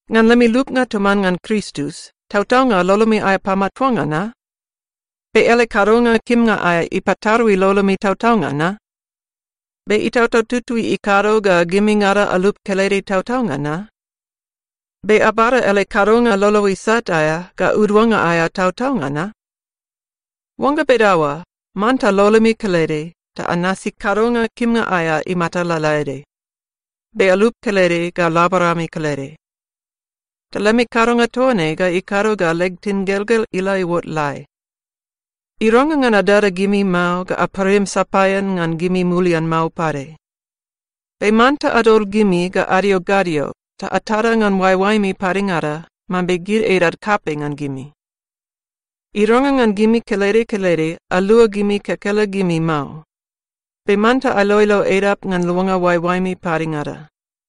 Ngan lemi lupnga toman ngan Kristus, tautaunga lolomi aea pamatuanga na? Be ele kadonga kimnga aea ipatarui lolomi tautaunga na? Be Itautau Tutui ikado ga gimingada alup kelede tautaunga na? Be abada ele kadonga lolo isat aea ga uduannga aea tautaunga na? Oangga bedaoa, manta lolomi kelede ta anasi kadonga kimnga aea imata lalaede, be alup kelede ga laborami kelede. Ta lemi kadonga toa ne ga ikado ga leg tingelgel ila iuot lai. Irangrang ngan adada gimi mao ga aparim sapaean ngan gimi mulian mao pade. Be manta adol gimi ga adio gadio ta atada ngan oaeoaemi padengada mambe gid edad kapei ngan gimi. Irangrang ngan gimi kelede kelede alua gimi kekelegimi mao, be manta ailoilo edap ngan luanga oaeoaemi padengada.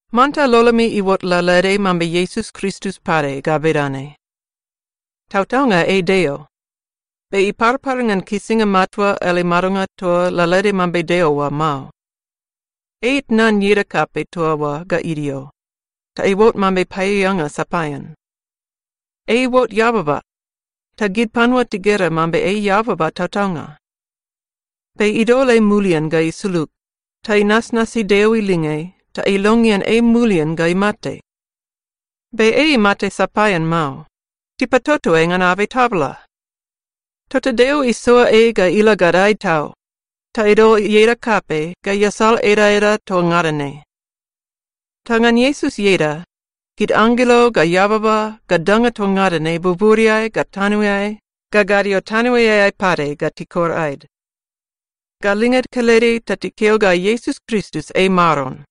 Manta lolomi iuot lalaede mambe Iesus Kristus pade ga bedane: Tautaunga ei Deo, be iparpar ngan kisinga matua ele madonga toa lalaede mambe Deo oa mao. Ei itnan ieda kapei toa oa ga idio, ta iuot mambe paeaeanga sapaean. Ei iuot eababa, ta gid panua tigera mambe ei eababa tautaunga. Be idol ei mulian ga isulug ta inasnasi Deo ilinge ta ilongean ei mulian ga imate. Be ei imate sapaean mao. Tipatoto ei ngan abei tabala! Tota Deo isoa ei ga ila gadae tau ta idol ieda kapei ga iasal edaeda toa ngada ne. Ta ngan Iesus ieda, gid anggelo ga eababa ga danga toa ngada ne buburiai ga tanoeai ga gadio tanoeai pade ga tikor aed ga linged kelede ta tikeo ga Iesus Kristus ei Maron.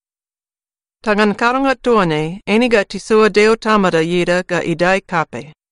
Ta ngan kadonga toa ne eine ga tisoa Deo Tamada ieda ga idae kapei.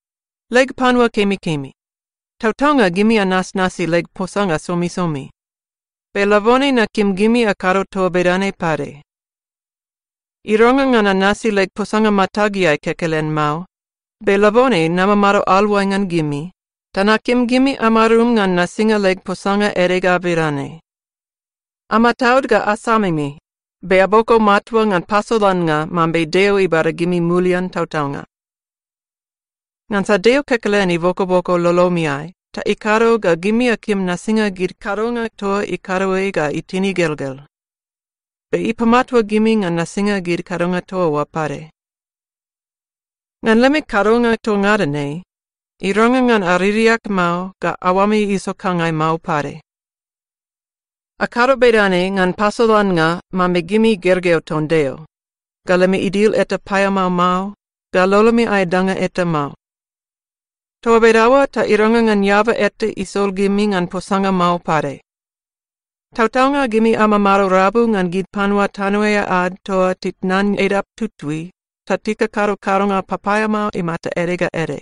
Leg panua kemikemi, tautaunga gimi anasnasi leg posanga somisomi. Be labone nakim gimi akado toa bedane pade. Irangrang ngan anasi leg posanga matageai kekelen mao, be labone namamado aluai ngan gimi, ta nakim gimi amarum ngan nasinga leg posanga ede ga bedane: Amataud ga asamimi be aboko matua ngan pasolannga mambe Deo ibada gimi mulian tautaunga. Ngansa Deo kekelen ibokoboko lolomiai ta ikado ga gimi akim nasinga gid kadonga toa ikado ei ga itin igelgel, be ipamatua gimi ngan nasinga gid kadonga toa oa pade. Ngan lemi kadonga toa ngada ne, irangrang ngan aririak mao ga aoami isokangai mao pade. Akado bedane ngan pasolannga mambe gimi gergeu ton Deo, ga lemi idil eta paeamao mao, ga lolomi aea danga eta mao. Toa bedaoa ta irangrang ngan eaba eta isol gimi ngan posanga mao pade. Tautaunga gimi amamado rabu ngan gid panua tanoeai ad toa titnan edap tutui ta tikakado kadonga papaeamao imata ede ga ede.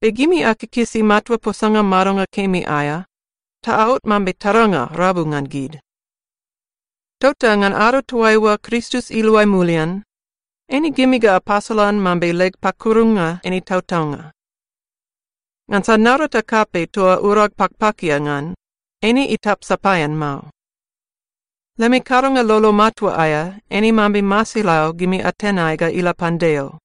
Be gimi akikisi matua posanga madonga kemi aea ta aot mambe taranga rabu ngan gid. Tota ngan ado toaiua Kristus iluai mulian, eine gimi ga apasolan mambe leg pakurunga eine tautaunga, ngansa naurata kapei toa urag pakpakia ngan, eine itap sapaean mao. Lemi kadonga lolo matua aea eine mambe masilau gimi atenai ga ila pan Deo.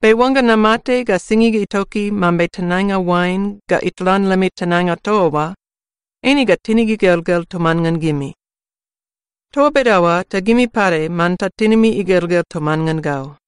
Be oangga namate ga singig itoki mambe tenainga oain ga itlan lemi tenainga toa oa, eine ga tinig igelgel toman ngan gimi. Toa bedaoa ta gimi pade manta tinimi igelgel toman ngan gau.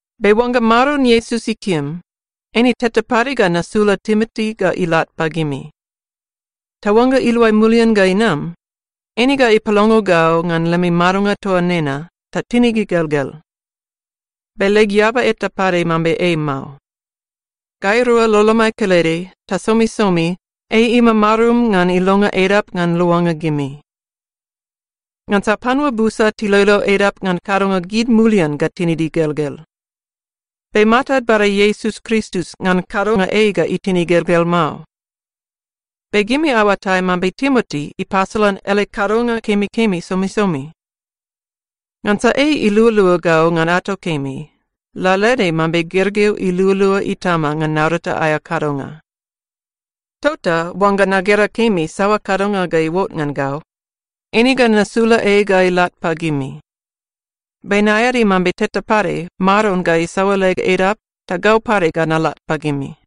Be oangga Maron Iesus ikim, eine teta pade ga nasula Timoti ga ilat pagimi. Ta oangga iluai mulian ga inam, eine ga ipalongo gau ngan lemi madonga toa nena ta tinig igelgel. Be leg eaba eta pade mambe ei mao. Gairua lolomai kelede ta somisomi ei imamarum ngan ilonga edap ngan luanga gimi. Ngansa panua busa tiloilo edap ngan kadonga gid mulian ga tinid igelgel. Be matad bada Iesus Kristus ngan kadonga ei ga itin igelgel mao. Be gimi aoatai mambe Timoti ipasolan ele kadonga kemikemi somisomi. Ngansa ei ilualua gau ngan ato kemi, lalaede mambe gergeu ilualua itama ngan naurata aea kadonga. Tota oangga nagera kemi saoa kadonga ga iuot ngan gau, eine ga nasula ei ga ilat pagimi. Be naeadi mambe teta pade Maron ga isaoa leg edap ta gau pade ga nalat pagimi.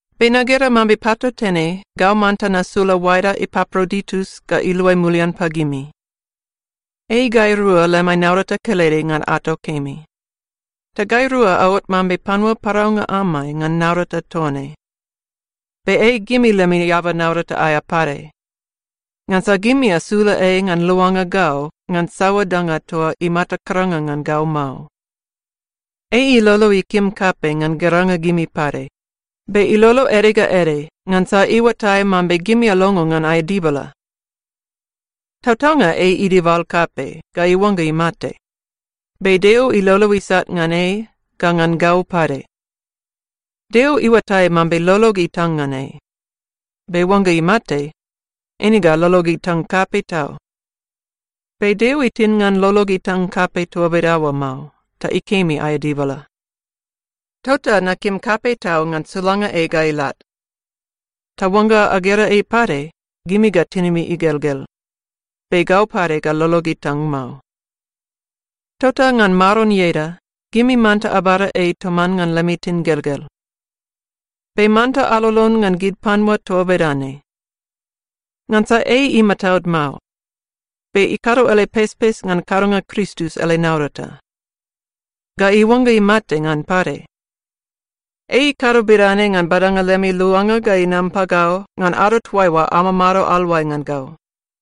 Be nagera mambe patautene gau manta nasula oaeda Epaproditus ga iluai mulian pagimi. Ei gairua lemai naurata kelede ngan ato kemi. Ta gairua aot mambe panua paraunga amai ngan naurata toa ne. Be ei gimi lemi eaba naurata aea pade, ngansa gimi asula ei ngan luanga gau ngan saoa danga toa imata karanga ngan gau mao. Ei ilolo ikim kapei ngan geranga gimi pade, be ilolo ede ga ede ngansa iuatai mambe gimi alongo ngan aea dibala. Tautaunga ei idibal kapei ga iuangga imate, be Deo ilolo isat ngan ei ga ngan gau pade. Deo iuatai mambe lolog itang ngan ei, be oangga imate, eine ga lolog itang kapei tau. Be Deo itin ngan lolog itang kapei toa bedaoa mao, ta ikemi aea dibala. Tota nakim kapei tau ngan sulanga ei ga ilat. Ta oangga agera ei pade, gimi ga tinimi igelgel, be gau pade ga lolog itang mao. Tota ngan Maron ieda, gimi manta abada ei toman ngan lemi tingelgel. Be manta alolon ngan gid panua toa bedane. Ngansa ei imataud mao, be ikado ele pespes ngan kadonga Kristus ele naurata, ga iuangga imate ngan pade. Ei ikado bedane ngan badanga lemi luanga ga inam pagau ngan ado toaiua amamado aluai ngan gau.